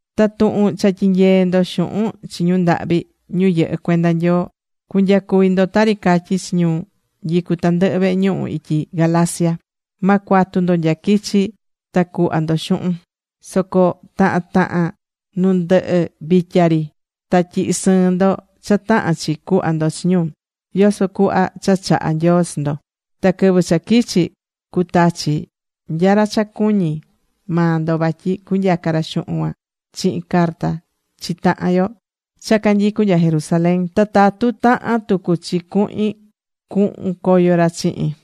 Ta tuhun cha tyinyeé ndo xuhun chi ñu ndahvi, ñu yɨhɨ́ cuenda Nyoo. Cu̱nyacuvi ndo tari catyí chi ñu nyicú tandɨhɨ vehe ñuhu ityi Galacia. Ma cuatu ndo nya quichi ta cuhva ndo xuhun. Soco tahan tahan nu ndɨhɨ vitya ri ta tyihi sɨɨn ndo cha tahán chi cuhva ndo chi ñu, yoso cuhva cha chahá Nyoo chi ndo. Ta quɨvɨ cha quichi, cutachi nya ra cha cuñí maa ndo vatyi cunyaca ra xuhun cuan chihin carta chi tahan yo cha canyicú nya Jerusalén. Ta tatu tahan tucu chi cuhin, cuhun coyo ra chihin.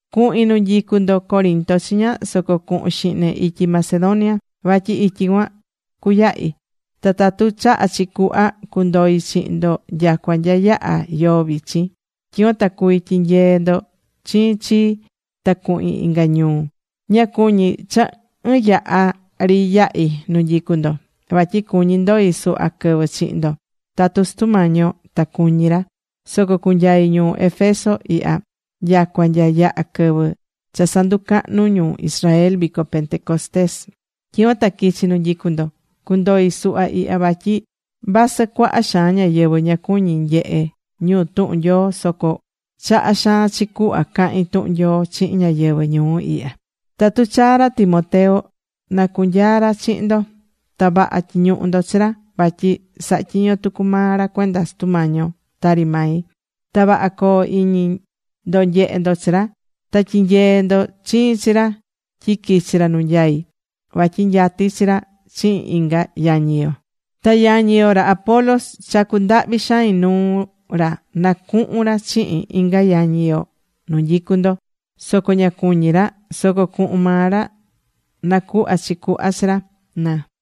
Cuhin nu nyicu ndo Corinto chiña, soco cuhun xihne ityi Macedonia. Vatyi ityi cuan cuyahi. Ta tatu chahá chi cuhva cundoi chihin ndo nyacua nya yahá yoo vichin. Tyicuan ta cuví tyinyeé ndo chiin chii ta cuhin inga ñuu. Ña cuñí cha ɨɨn yaha ri yahi nu nyicu ndo. Vatyi cuñí ndoi suhva quɨvɨ chihin ndo tatu Sutu Mañi yo ta cuñí ra. Soco cunyai ñuu Éfeso ihya, nyacua nya yaha quɨvɨ cha sanducahnú ñu Israel vico Pentecostés. Tyicuan ta quichi nu nyicu ndo. Cundoi suhva ihya vatyi vasɨ cuaha xaan ñáyɨvɨ ña cuñí nyehe ñu tuhun Nyoo, soco chahá xaan chi cuhva cahín tuhun Nyoo chihin ñáyɨvɨ ñuu ihya. Tatu chaa ra Timoteo, na cunyaa ra chihin ndo. Ta vaha tyi̱ñuhu ndo chi ra. Vatyi sahá tyiño tucu maa ra cuenda Sutu Mañi yo tari mai. Ta vaha co̱o iñi ndo nyehé ndo chi ra. Ta tyi̱nyee ndo chiin chi ra tyi quichi ra nu nyaí. Vatyi nyatí chi ra chihin inga yañi yo. Ta yañi yo, ra Apolos, chacu̱ ndahvi xain nuu ra nacuhun ra chihin inga yañi yo nu nyicu ndo. Soco ña cuñí ra. Soco cuhun maa ra nacuhva chi cuhva chi ra, na.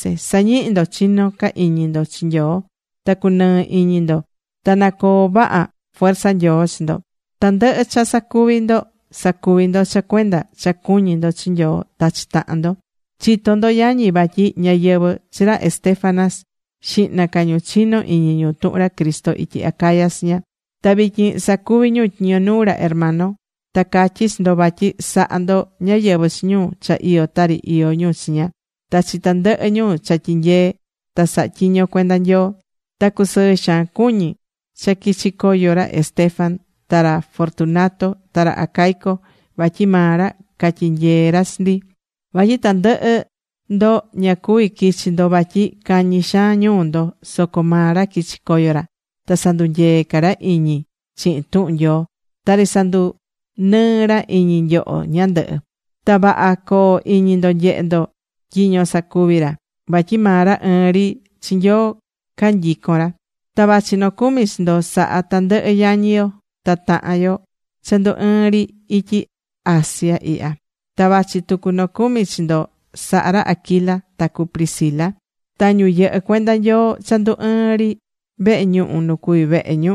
Sa̱ñihi ndo chinó ca iñi ndo chi Nyoo. Ta cunɨɨ iñi ndo ta nacoo vaha fuerza Nyoo chi ndo. Tandɨhɨ cha sacuví ndo, sa̱cuvi ndo cha cuenda cha cuñí ndo chi Nyoo ta chi tahan ndo. Chitó ndo yañi vatyi ñáyɨvɨ chi ra Estéfanas xihna ca ñu chinó iñi tuhun ra Cristo ityi Acaya chiña. Ta vityin sacuví ñu tyiño nuu ra hermano. Ta catyí chi ndo vatyi sa̱ha ndo ñáyɨvɨ chi ñu cha iyó tari iyó ñu chiña, ta chi tandɨhɨ ñu cha tyinyeé ta sahá tyiño cuenda Nyoo. Ta cusɨɨ xaan cuñi cha quichi̱ coyo ra Estéfanas ta ra Fortunato ta ra Acaico. Vatyi maa ra catyinyeé ra chi ndi. Vatyi tandɨhɨ ndo ña cuví quichi ndo vatyi cañi xaan ñuu ndo. Soco maa ra quichi̱ coyo ra. Ta sandunyeé ca ra iñi chihin tuhun Nyoo. Tari sandunɨɨ́ ra iñi nyoho ñandɨhɨ. Ta vaha co̱o iñi ndo nyehé ndo tyiño casacuví ra. Vatyi maa ra ɨɨn ri chi Nyoo canyicón ra. Ta vachí nocumi chi ndo sahá tandɨhɨ yañi yo ta tahan yo cha ndu ɨɨ́n ri ityi Asia ihya. Ta vachi tucu nocumi chi ndo sahá ra Aquila ta cu Priscila, ta ñu yɨhɨ́ cuenda Nyoo cha ndu ɨɨn ri vehe ñuhu nu cuví vehe ñu.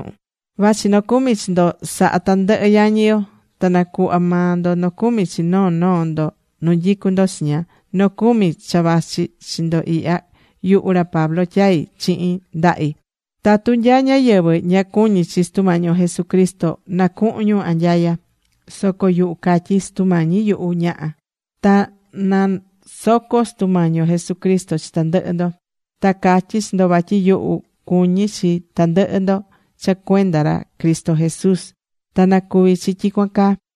Vachi nocumi chi ndo sahá tandɨhɨ yañi yo, ta na̱cuhva maa ndo nocumi chi noo noo ndo nu nyicú ndo chiña. Nocumi cha vachí chi ndo ihya, yuhu ra Pablo tyai̱ chihin ndahi. Tatu nya ñáyɨvɨ ña cuñí chi Sutu Mañi yo Jesucristo, nacuhun ñu anyaya. Soco yuhu catyí: ¡Sutu Mañi yuhu, ña̱ha! Ta nasoco Sutu Mañi yo Jesucristo chi tandɨhɨ ndo. Ta catyí chi ndo vatyi yuhu cuñí chi tandɨhɨ ndo cha cuenda ra Cristo Jesús. Ta nacuví chi tyicuan caa.